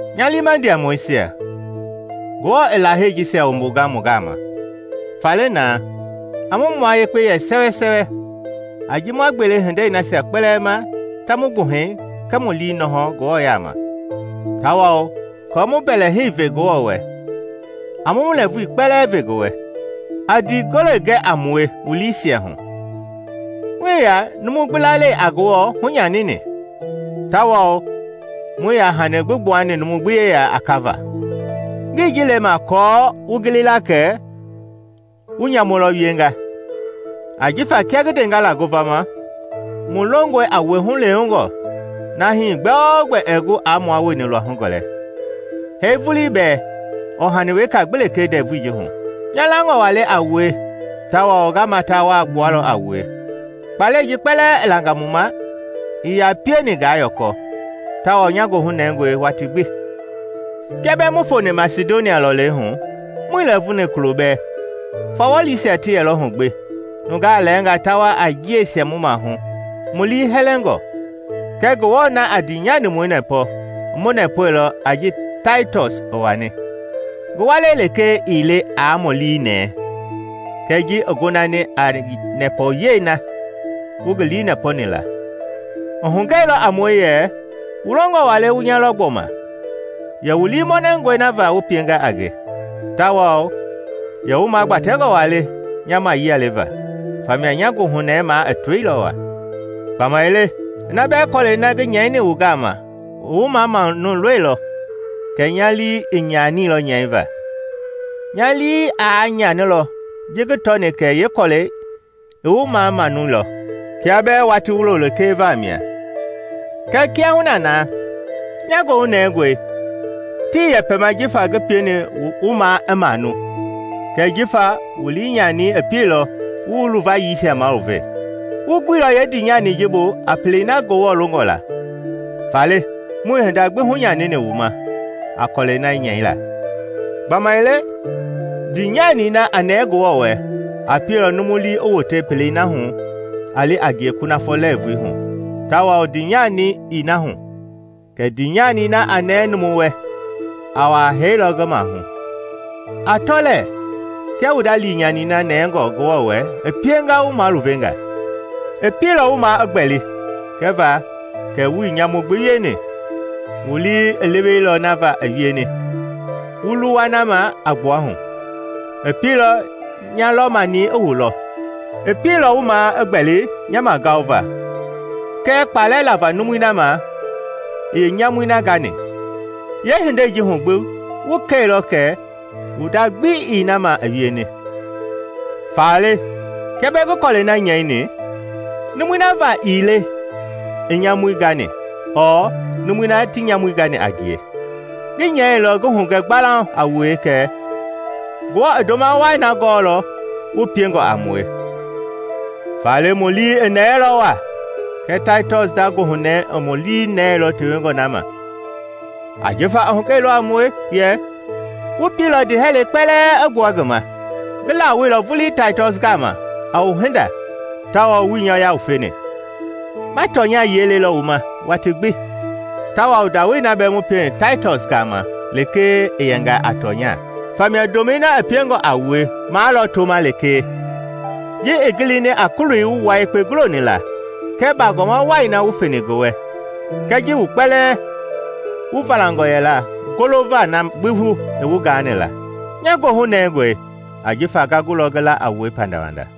Nya liima ndiamɔisia, Ngewɔ i Lahei jisia wumbunga mu gama. Faale na, a mu mua yekpe yɛ sɛwɛ a ji ma gbele hindei nasia kpɛlɛɛ ma ta mu gbuhɛi kɛɛ mu lii nɔhɔ Ngewɔ yaama. Tawao aako mu mbɛlɛhei ve Ngewɔ wɛ, a mu mu lɛɛvui kpɛlɛɛ ve ngi wɛ. A ndii gole gɛ a mue wu liisiahu. Muii yaa nyamu gani a numu gbi; muii yaa numu gbi lalei a Ngewɔ hunyanini, tawao muii yaa hani gbi gbuani numu gbi yeya a kava. Ngii ji lema aako wu gili la kɛ wu nyamu lɔ wienga; ajifa kia ngi ndenga la ngovama, mu longɔe a wue hulewengɔ na hii gbɛogbɛ ɛɛ gu aa mua wueni luahu gɔlɛ, hee vulii bɛɛ ɔɔ hani weka gbi lekee ndɛvui ji hu. Nya langɔ waa le a wue tawao nga mata waa gbualɔ a wue! Kpalɛi ji kpɛlɛɛ i langa mu ma ii yaa pieni ngaa yɔkɔ; tawao nya goohu nɛngɔe watii gbi. Kia bɛɛ mu foni Masidonia lɔlei hu muii lɛɛvuni kulo bɛɛ. Fawɔlisia ti yɛlɔ hu gbi, nungaa lɛɛnga ta wa a njiɛisia mu mahu, mu lii hɛlɛngɔ. Kɛɛ Ngewɔ na a ndiinyanimɔi nɛpɔ, i mu nɛpɔilɔ a ji Taitɔs i wani. Ngi walei lekee ii le aa mu lii nɛɛ, kɛ ji i gonani a nɛpɔyei na wu ngi lii nɛpɔni la. I hugɛilɔ a mue yɛ wu longɔ waa le wu nya lɔ gbɔma, yɛ wu lii mɔnɛngɔe na va wu pienga a nge, tawao yɛ wu magbatɛngɔ waa le nya mayialeva; famia nya goohunɛɛi maa i toilɔ waa. Gbamaile ina bɛɛ kɔlɛi na ngi nyɛini wu gama i wu mamanuilɔ, kɛ nya lii ii nyanini nyɛiva. Nya lii aa nyanilɔ ji ngi tɔni kɛ yeekɔlɛi i wu mamanuilɔ kia bɛɛ watii wulo lekee vamia. Kɛɛ kiahuna na, nya goohu nɛngɔe, tii yɛma jifa ngi pieni wu maa i manu, kɛɛ jifa wu liinyani i pielɔ wu wu luvayiisia maluve. Wu guilɔ yeendinyanii bu a pelei na Ngewɔ longɔ la, faale muii hinda gbi hunyanini wu ma a kɔlɛi na nyɛila. Gbamaile ndiinyani na a nɛɛ Ngewɔ wɛ a pielɔ numu lii i wote pelei na hu a li a ngie kunafɔ lɛɛvui hu tawao ndiinyani ii na hu! Kɛɛ ndiinyani na a nɛɛ numu wɛ a wa hee lɔ ngi mahu. A tɔ lɛɛ kia wu nda liinyani na nɛngɔ Ngewɔ wɛ i pienga wu maluvenga: i pielɔ wu maa i gbɛli kɛva kɛ wuii nyamu gbi wieni. Wu lii i leweilɔ na va i wieni, wu luwa na ma a gbua hu. I pielɔ nya lɔ-mani i wu lɔ; i pieilɔ wu maa i gbɛli nya magaova kɛɛ kpalɛ lava numui na ma i yeenyamui na gani. Yeehindei ji hu gbi wu kɛilɔ kɛ wu nda gbi ii na ma i wieni. Faale kia bɛɛ ngi kɔlɛi na nyɛini, numui na va ii le i nyamui gani ɔɔ numui na ti nyamui gani a ngie. Ngi nyɛilɔ ngi hugɛ gbalauŋ a wue kɛ Ngewɔ i ndoma wai na gɔɔlɔ wu piengɔ a mue. Faale mu lii i nɛɛilɔ waa, kɛɛ Taitɔs nda goohunɛɛi i mu lii nɛɛilɔ tewengɔ na ma. Ajifa i hugɛilɔ a mue yɛ wu pielɔ ndiihɛlɛi kpɛlɛɛ i gbua ngi ma. Ngi lawoeilɔ vulii Taitɔs gama a wu hinda tawao wuii nya yawufeni. Ma tɔnya yiɛi lɔ le wu ma watii gbi tawao ndawoei na bɛɛ mu pieni Taitɔs gama lekee i yɛnga a tɔnya. Famia ndomɛi na i piengɔ a wue maa lɔ toma lekee, ji i gilini a kuloi wu wua yekpe guloni la kɛɛ baagɔma wai na wu feni ngi wɛ kɛɛ ji wu kpɛlɛɛ wu valangɔ yɛla golova na gbi bu i wu gaani la. Nya goohu nɛngɔe jifa nga gulɔ ngi la a wue pandawanda.